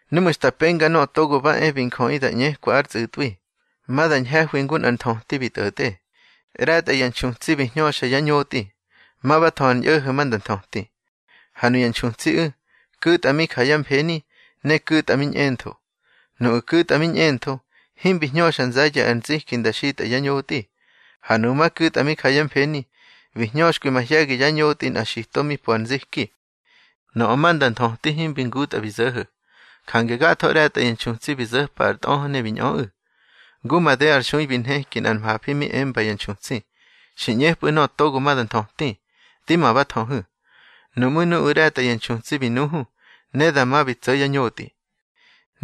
Núꞌmu̱ xta penga Nöꞌö Togo ba e bi Njöꞌi da ꞌñekwa ár tsꞌu̱tꞌwi, ma da ñhe̱hwi ngu nꞌar nthöti bi tꞌo̱tꞌe. ꞌRe̱tꞌa ya nxutsi bi hñöxa yá ñotꞌi, ma ba thö ar ñꞌo̱ho̱ ma nda nthöti. Ha nuya nxutsiꞌu̱, ku̱tꞌa mi ja yá mfeni ne ku̱tꞌa mi ñꞌentho. Nuꞌu̱ ku̱tꞌa mi ñꞌentho, himbi hñöxa nze̱ye̱ ar nziki da xitꞌa yá ñotꞌi. Ha nuꞌu̱ ma ku̱tꞌa mi ja yá mfeni, bi hñöxkwi mahye̱gi yá ñotꞌi nꞌa xito mi po ar nziki. Nöꞌö ma nda nthöti himbi ngutꞌa bi zo̱ho̱, jange gatho ꞌre̱tꞌa ya nxutsi bi zo̱pa ar tꞌöhö ne bi ñꞌöꞌu̱. Ngu made ar xui bi nheki nꞌar mhafi mi emba ya nxutsi: Xi ꞌñepꞌu̱ nöꞌö togo ma da nthöti. Di ma ba thöhu̱. Nuꞌmú̱ nuꞌu̱ ꞌre̱tꞌa ya nxutsi bi nuhu, ne dama bi tso̱ yá ñotꞌi.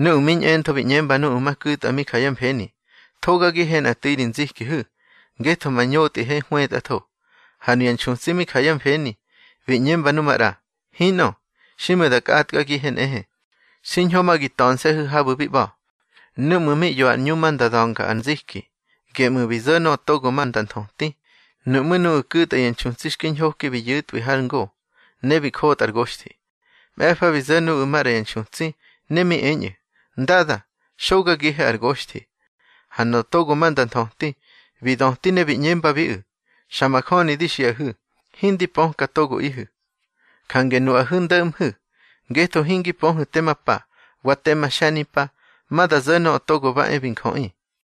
Nuꞌu̱ mi ñꞌentho bi ꞌñemba nu ma ku̱tꞌa mi ja yá mfeni: Thogagihe nꞌa tu̱i ri nzikihu̱, ngetho ma ñotꞌihe hwetꞌatho. Ha nuya nxutsi mi ja yá mfeni, bi ꞌñemba nu maꞌra: Hinꞌö, xiꞌmu̱ da kꞌatkagihe nꞌe. Xiñho ma gi ta̱nse̱hu̱ habu̱ bi ꞌba̱. Núꞌmu̱ mi ꞌyo ar ꞌñu ma nda da̱nga ar nziki, geꞌmu̱ bi zo̱ nöꞌö togo ma nda nthöti. Nuꞌmú̱ nuꞌu̱ ku̱tꞌa ya nxutsi xki ñhoki bi yu̱tꞌwi har ngo, ne bi njotꞌa ar goxthi. Mꞌe̱fa bi zo̱ nuꞌu̱ maꞌra ya nxutsi, ne mi eñꞌu̱: Ndada, xogagihe ar goxthi. Ha nöꞌö togo ma nda nthöti, bi döti ne bi ꞌñembabiꞌu̱: Xa majöni di xiꞌahu̱, hindi pöka togoꞌihu̱. Jange nuꞌahu̱ ndo̱ꞌmhu̱, ngetho hingi pöhu̱ tema pa, wa tema xe̱nimpa, ma da zo̱ Nöꞌö Togo ba e bi Njöꞌi.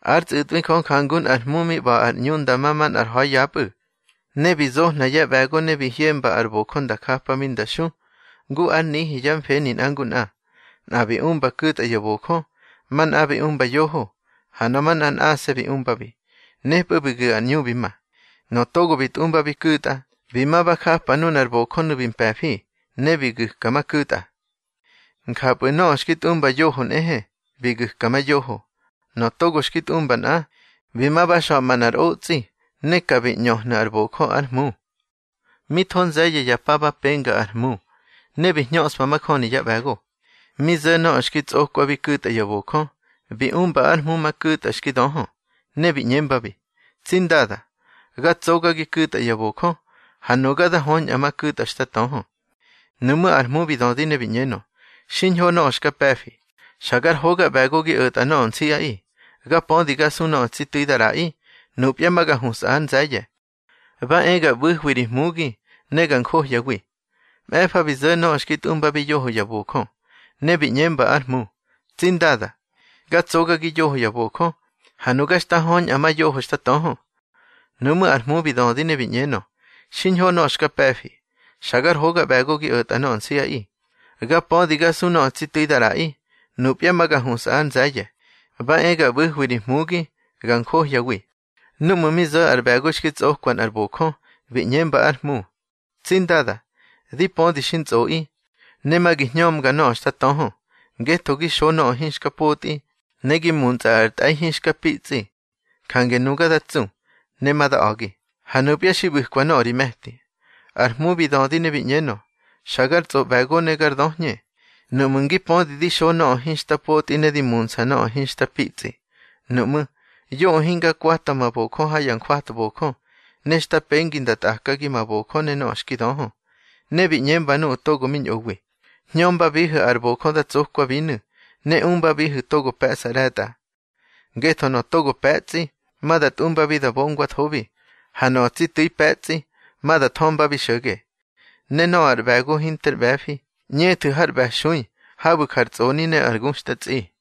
Ár tsꞌu̱tꞌwi Jö jangu nꞌar hmu mi ꞌba̱ ar ꞌñu nda ma manꞌar ha̱i yapꞌu̱. Ne bi zohna yá ꞌbe̱go ne bi hyemba ár bojö nda japabi nda xu, ngu ár nihi yá mfeni nꞌa ngu nꞌa. Nꞌa bi umba ku̱tꞌa ya bojö, manꞌa bi umba yoho, ha nöꞌö manꞌa nꞌase̱ bi umbabi. Nepꞌu̱ bi gu̱ ar ꞌñu bi ma. Nöꞌö togo bi tꞌumbabi ku̱tꞌa, bi ma ba japa nunar bojönu̱ bi mpe̱fi, ne bi gu̱ka ma ku̱tꞌa. Njapꞌu̱ nöꞌö xki tꞌumba yoho nꞌehe, bi gu̱ka ma yoho. Nöꞌö togo xki tꞌumba nꞌa, bi ma ba xa̱ꞌma nꞌar otsꞌi, ne ka bi ꞌñöhnu̱ ár bojö ár hmu. Mi tho nze̱ye̱ ya pa ba penga ar hmu, ne bi hñöꞌspa majöni yá ꞌbe̱go. Mi zo̱ nöꞌö xki tsꞌokwabi ku̱tꞌa ya bojö, bi umba ár hmu ma ku̱tꞌa xki döhö, ne bi ꞌñembabi: Tsi ndada, ga tsogagi ku̱tꞌa ya bojö, ha nuga da höñꞌa ma ku̱tꞌa xta töhö. Nuꞌmú̱ ar hmu bi dödi ne bi ꞌñenö: Xiñho nöꞌö xka pe̱fi, xa gar hoga ꞌbe̱go gi o̱tꞌa nöꞌö nsiꞌaꞌi. Ga pödi ga su nöꞌö tsi tu̱i da ꞌraꞌi. Nupya ma ga husꞌa ár nze̱ye̱. Ba e ga ꞌbu̱hwi ri hmugi, ne ga njohyawi. Mꞌe̱fa bi zo̱ nöꞌö xki tꞌumbabi yoho ya bojö, ne bi ꞌñemba ár hmu: Tsi ndada, ga tsogagi yoho ya bojö, ha nuga xta höñꞌa ma yoho xta töhö. Nuꞌmú̱ ar hmu bi dödi ne bi ꞌñenö: Xiñho nöꞌö xka pe̱fi, xa gar hoga ꞌbe̱go gi o̱tꞌa nöꞌö nsiꞌaꞌi. Ga pödi ga su nöꞌö tsi tu̱i da ꞌraꞌi. Nupya ma ga husꞌa ár nze̱ye̱. Ba e ga ꞌbu̱hwi ri hmugi, ga njohyawi. Núꞌmu̱ mi zo̱ ar ꞌbe̱go xki tsꞌokwa nꞌar bojö, bi ꞌñemba ár hmu: Tsi ndada, di pödi xi ntsꞌoꞌi, ne ma gi hñömga nöꞌö xta töhö, ngetho gi xo nöꞌö hinxka potꞌi, ne gi muntsꞌa ar tꞌe̱i hinxka pitsꞌi. Jange nuga da tsu, ne ma da a̱gi, ha nupya xi ꞌbu̱kwa nöꞌö ri me̱ti. Ar hmu bi dödi ne bi ꞌñenö: Xa gar tsꞌoꞌbe̱go ne gar döhñe. Nuꞌmu̱ ngi pödi di xo nöꞌö hinxta potꞌi ne di muntsꞌa nöꞌö hinxta pitsꞌi, nuꞌmú̱, yoꞌö hinga kwata ma bojö ha ya jwatbojö, ne xta pengi nda tꞌakagi ma bojö ne nöꞌö xki döhö. Ne bi ꞌñemba nuꞌu̱ togo mi ñꞌowi: Hñömbabihu̱ ar bojö da tsokwabinu̱, ne umbabihu̱ togo pe̱ꞌsa ꞌre̱tꞌa. Ngetho nöꞌö togo pe̱tsꞌi, ma da tꞌumbabi da bongwathobi, ha nöꞌö tsi tu̱i pe̱tsꞌi, ma da thömbabi xo̱ge. Ne nöꞌö ar ꞌbe̱go hinter ꞌbe̱fi, ꞌñethu̱ har ꞌbe̱xui habu̱ jar tsꞌoni ne ar nguxtꞌatsꞌi.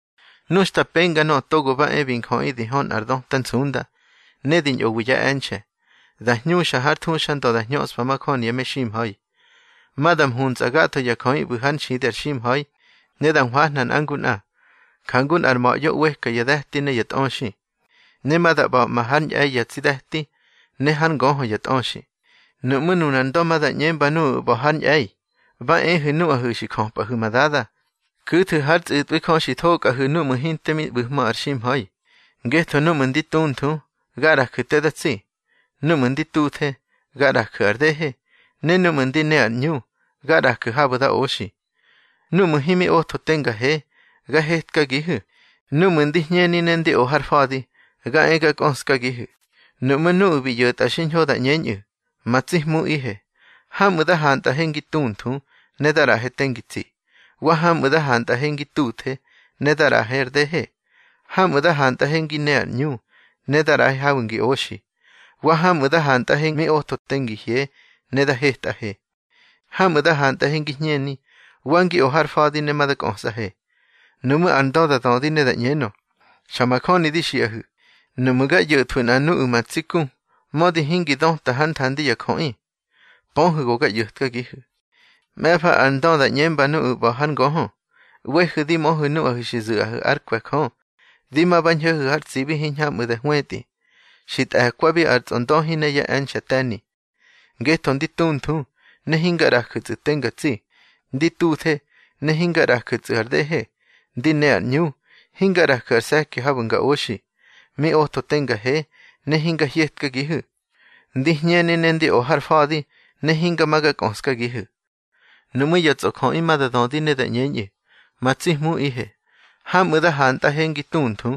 Nu xta penga Nöꞌö Togo ba e bi Njöꞌi di hö nꞌar döta nsunda, ne di ñꞌowi yá e̱nxe̱, da hñuxa hár thuxandö da hñöꞌspa majöni ya meximha̱i. Ma da mhuntsꞌa gatho ya jöꞌi ꞌbu̱ hár nxidi ar ximha̱i, ne da hwahna nꞌa ngu nꞌa, njangu nꞌar ma̱ꞌyo ꞌweka ya de̱ti ne ya tꞌöxi. Ne ma da ꞌba̱ꞌma hár ñꞌe̱i ya tsi de̱ti, ne hár ngöhö ya tꞌöxi. Nuꞌmú̱ nunar Ndö ma da ꞌñemba nuꞌu̱ ꞌba̱ hár ñꞌe̱i: Ba ehu̱ nuꞌahu̱ xi jöpꞌahu̱ ma Dada, ku̱thu̱ hár tsꞌu̱tꞌwi Jö xi thokꞌahu̱ núꞌmu̱ hinte mi ꞌbu̱hmö ar ximha̱i. Ngetho núꞌmu̱ ndi tunthu, ga ꞌraju̱ te da tsi. Núꞌmu̱ ndi tuthe, ga ꞌraju̱ ar dehe, ne núꞌmu̱ ndi ne ar ꞌñu, ga ꞌraju̱ habu̱ da oxi. Núꞌmu̱ himi otho te nga he, ga hetkagihu̱. Núꞌmu̱ ndi hñeni ne ndi o ar fa̱di, ga e ga kꞌöskagihu̱. Nuꞌmú̱ nuꞌu̱ bi ꞌyo̱tꞌa xiñho da ꞌñeñꞌu̱: Ma tsi Hmuꞌihe, hamꞌu̱ da hantꞌahe ngi tunthu, ne da ꞌraꞌahe te ngi tsi. Wa hamꞌu̱ da hantꞌahe ngi tuthe, ne da ꞌraꞌahe ar dehe. Hamꞌu̱ da hantꞌahe ngi ne ar ꞌñu, ne da ꞌraꞌahe habu̱ ngi oxi. Wa hamꞌu̱ da hantꞌahe mi otho te ngi hye, ne da hetꞌahe. Hamꞌu̱ da hantꞌahe ngi hñeni, wa ngi o ar fa̱di, ne ma da kꞌösꞌahe. Nuꞌmú̱ ar Ndö da dödi ne da ꞌñenö: Xa majöni di xiꞌahu̱, nuꞌmu̱ ga ꞌyo̱thwu̱ nꞌa nuꞌu̱ ma tsi ku, mödi hingi döta hár nthandi ya jöꞌi, pöhu̱ go ga ꞌyo̱tkagihu̱. Mꞌe̱fa ar Ndö da ꞌñemba nuꞌu̱ ꞌba̱ hár ngöhö: ꞌWehu̱ di möhu̱ nuꞌahu̱ xi zu̱ꞌahu̱ ár kwe̱ Jö. Di ma ba ñho̱hu̱ har tsibi hiñhamꞌu̱ da hwetꞌi, xi tꞌe̱kwabi ar tsꞌondöhi ne yá e̱nxe̱ te̱ni. Ngetho ndi tunthu, ne hinga ꞌraju̱tsꞌu̱ te nga tsi. Ndi tuthe, ne hinga ꞌraju̱tsꞌu̱ ar dehe. Ndi ne ar ꞌñu, hinga ꞌraju̱ ar se̱ki habu̱ nga oxi. Mi otho te nga he, ne hinga hyetkagihu̱. Ndi hñeni ne ndi o ar fa̱di, ne hinga ma ga kꞌöskagihu̱. Nuꞌmú̱ ya tsꞌojöꞌi ma da dödi ne da ꞌñeñꞌu̱: Ma tsi Hmuꞌihe, hamꞌu̱ da hantꞌahe ngi tunthu,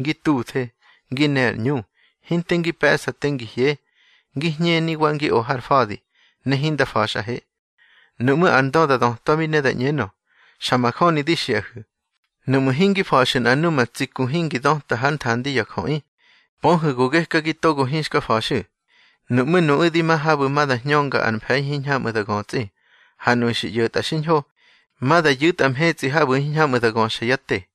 ngi tuthe, ngi ne ar ꞌñu, hinte ngi pe̱ꞌsa te ngi hye, ngi hñeni wa ngi o har fa̱di, ne hinda fa̱xꞌahe. Nuꞌmú̱ ar Ndö da dötwabi ne da ꞌñenö: Xa majöni di xiꞌahu̱, nuꞌmu̱ hingi fa̱xu̱ nꞌa numa tsi ku hingi döta hár nthandi ya jöꞌi, pöhu̱ go gekagi togo hinxka fa̱xu̱. Nuꞌmú̱ nuꞌu̱ di ma habu̱ ma da hñönga ar mfe̱i hiñhamꞌu̱ da götsꞌi. Ha nuꞌu̱ xi ꞌyo̱tꞌa xiñho, ma da yu̱tꞌa mhetsꞌi habu̱ hiñhamꞌu̱ da göxa yá te.